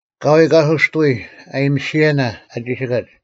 ᐊᑲᐎᔾ ᑲᓱᔅᑕᐎ ᐊᔨᒥᓯᔭᓇ ᐊ ᒋᓯᑲᒡ;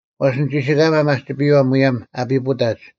ᐛᔅ ᓂᒋᓯᑲᒪ ᒪᒋᐱᔪᐛ ᒧᔭᒻ ᐊ ᐱᐳᑕᒡ,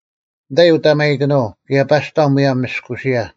ᓂᑕᐃ ᐅᑕᒪᔨᑭᓄᐤ, ᑭᔭ ᐸᔅᑕᐤ ᒧᔭᒻ ᒥᔅᑯᓯᔭ;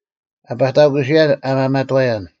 ᐊ ᐸᑕᑯᓯᔭᓐ ᐊ ᒪᒪᑥᔭᓐ,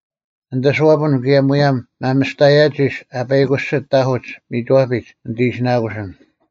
ᓂᑦ ᐊᓱᐛᐱᓐ, ᑭᔭ ᒧᔭᒻ ᒪᒥᔅᑕᔭᒋᔅ ᐊ ᐸᐃᑯᓯᑦ ᑕᐧᑯᒡ ᒥᒋᐛᐱᒡ ᓂᑦ ᐃᓯᓇᑯᓯᓐ᙮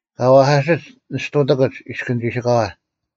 ᑲ ᐛᐧᑲᓯᒡ ᓂ ᔅᑐᑎᑯᒡ ᐃᔅᑭᓐ ᒋᓯᑲᐛ;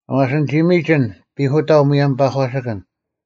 ᐛᔅ ᓂᒋ ᒥᒋᓐ ᐱᐧᑯᑕᐤ ᒧᔭᒻ ᐸᒂᓯᑭᓐ,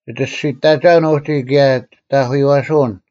ᒋᒋᓯᔅᑕᒐᐅᓐ ᐅᒋ ᑭᔭ ᒋᑦ ᐊᐧᑯᔪᐛᓱᐅᓐ;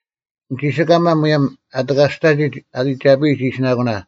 ᓂᒋᓯᑲᒪ ᒧᔭᒻ ᐊ ᑎᑲᔅᑕᒋᒡ ᐊ ᐃᒐᐱᔨᒡ ᐃᓯᓇᑯᓇ;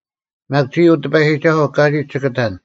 ᒪᒃ ᒋᔾ, ᐅ ᑎᐸᔨᒋᒐᓱᐤ, ᑲᒋᒡ ᒋᑭ ᑕᓐ;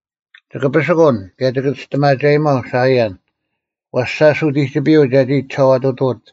ᒋᑭ ᐱᓯᑯᓐ, ᑭᔭ ᒋᑭ ᒋᔅᑎᒪᒐᔨᒪᐤ ᓴᐃᔭᓐ: ᐛᔅ ᓴᔅ ᐅᑎᒋᐱᔪᐤ ᒐᒋ ᒋᓴᐛᑐᑐᐅᑦ,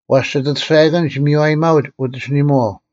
ᐛᔅ ᒋᑦ ᐊᑐᔅᒐᔭᑭᓐᒡ ᒥᔽᔨᒥᒪᐅᒡ ᐅᑦ ᐊᓯᓂᒥᐛᐤ,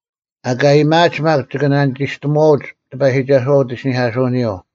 ᐊᑲ ᐊᔭᒥᐊᒡ ᒪᒃ ᒋᑭ ᓇᓂᒋᔅᑎᒺᐅᒡ ᑎᐸᔨᒋᒐᓱᐛ ᐅᑦ ᐃᓯᓂᐧᑲᓱᐅᓂᔪᐤ,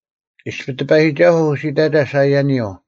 ᐃᔅᐱ ᑎᐸᔨᒋᒐᓱᐤ ᐅᓯᑕᒐ ᓴᐃᔭᓂᔪᐤ,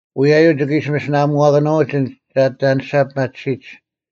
ᐅᔭᔪᐤ ᒋᑭ ᐃᓯ ᒥᓯᓇᐊᒧᐛᑭᓄᐅᒡ ᐊᓐᒡ ᒐ ᐊᑎ ᐊᓂᔅᒐ ᐱᒪᑎᓯᒡ;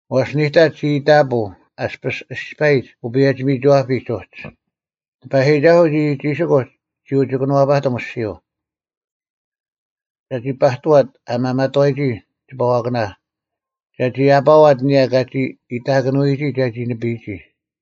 ᐛᔅ ᓂᑕᒡ ᒋ ᐃᑕᐳᐤ ᐊᔅᐱᔅ ᐃᔅᐸᔨᒡ ᐅᐸᔭᒋ-ᒥᒋᐛᐱᒡ ᐅᒡ; ᑎᐸᔨᒋᒐᓱᐤ ᒋᒋᒋᓯᑯᒡ ᒋ ᐅᒋ ᑭᓄᐛᐸᑎᒻ ᐊᔅᒋᔪᐤ; ᒐᒋ ᐸᑐᐛᑦ ᐊ ᒪᒪᑥᔨᒋ ᒋᐸᐛᑭᓇ; ᒐᒋ ᐊᐸᐛᑦ ᐊᓂᔭ ᑲᒋ ᐃᑕᑭᓄᐎᒋ ᒐᒋ ᓂᐱᔨᒋ;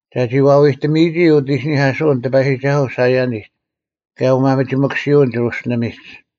ᒐᒋ ᐛᐎᑎᒥᔨᒋ ᐅᑦ ᐃᓯᓂᐧᑲᓱᐅᓐ ᑎᐸᔨᒋᒐᓱᐤ ᓴᐃᔭᓂᒡ, ᑭᔭ ᐅᒪᒥᒋᒥᑯᓯᐅᓐ ᒋᕈᓯᓕᒥᒡ;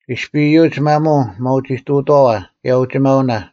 ᐃᔅᐱ ᐃᔪᒡ ᒪᒧᐤ ᒪᐅᒋᑐᑥᐛ, ᑭᔭ ᐅᒋᒪᐅᓇ,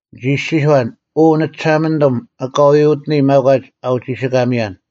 ᓂᒋ ᐃᔅᒋᔄᓐ, “ᐅ ᓂᒋᓴᒪᓂᑐᒻ, ᐊᑲᐎᔾ ᐅᑎᓂ ᒪᒂᒡ ᐊ ᐅᒋᓯᑲᒥᔭᓐ: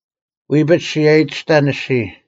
ᐎᐱᒡ ᔅᒋ ᐊᔨᑎᔅᑕᓐ ᐊᔅᒋᔾ;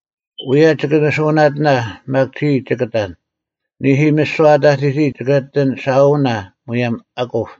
ᐅᔭ ᒋᑭ ᓂᓱᐅᓇᑎᓇ, ᒪᒃ ᒋᔾ ᒋᑭ ᑕᓐ; ᓂᐦᐃ, ᒥᓯᐛ ᐊ ᑕᑎᒋ ᒋᑭ ᐊᑎ ᓴᐅᓇ ᒧᔭᒻ ᐊᑯᑉ;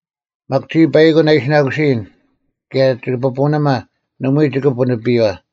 ᒪᒃ ᒋᔾ ᐸᐃᑯᓐ ᐊᓯᓇᑯᐃᔨᓐ, ᑭᔭ ᒋᐱᐳᓂᒪ ᓂᒪᐎᔾ ᒋᑭ ᐳᓂᐱᔪᐛ᙮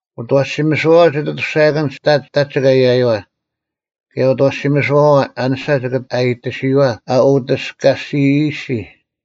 ᐅᑦ ᐊᐛᓯᒥᓱᐛᐛ ᒋᑦ ᐊᑐᔅᒐᔭᑭᓐᒡ ᑕᒡ ᒋᑭ ᐊᔭᔪᐛ, ᑭᔭ ᐅᑦ ᐊᐛᓯᒥᓱᐛᐛ ᐊᓂᔅᒐ ᒋᑭ ᐊᔨᑎᓯᔪᐛ ᐊ ᐅᑎᔅᑲᔅᒋᔨᔅᒋ᙮”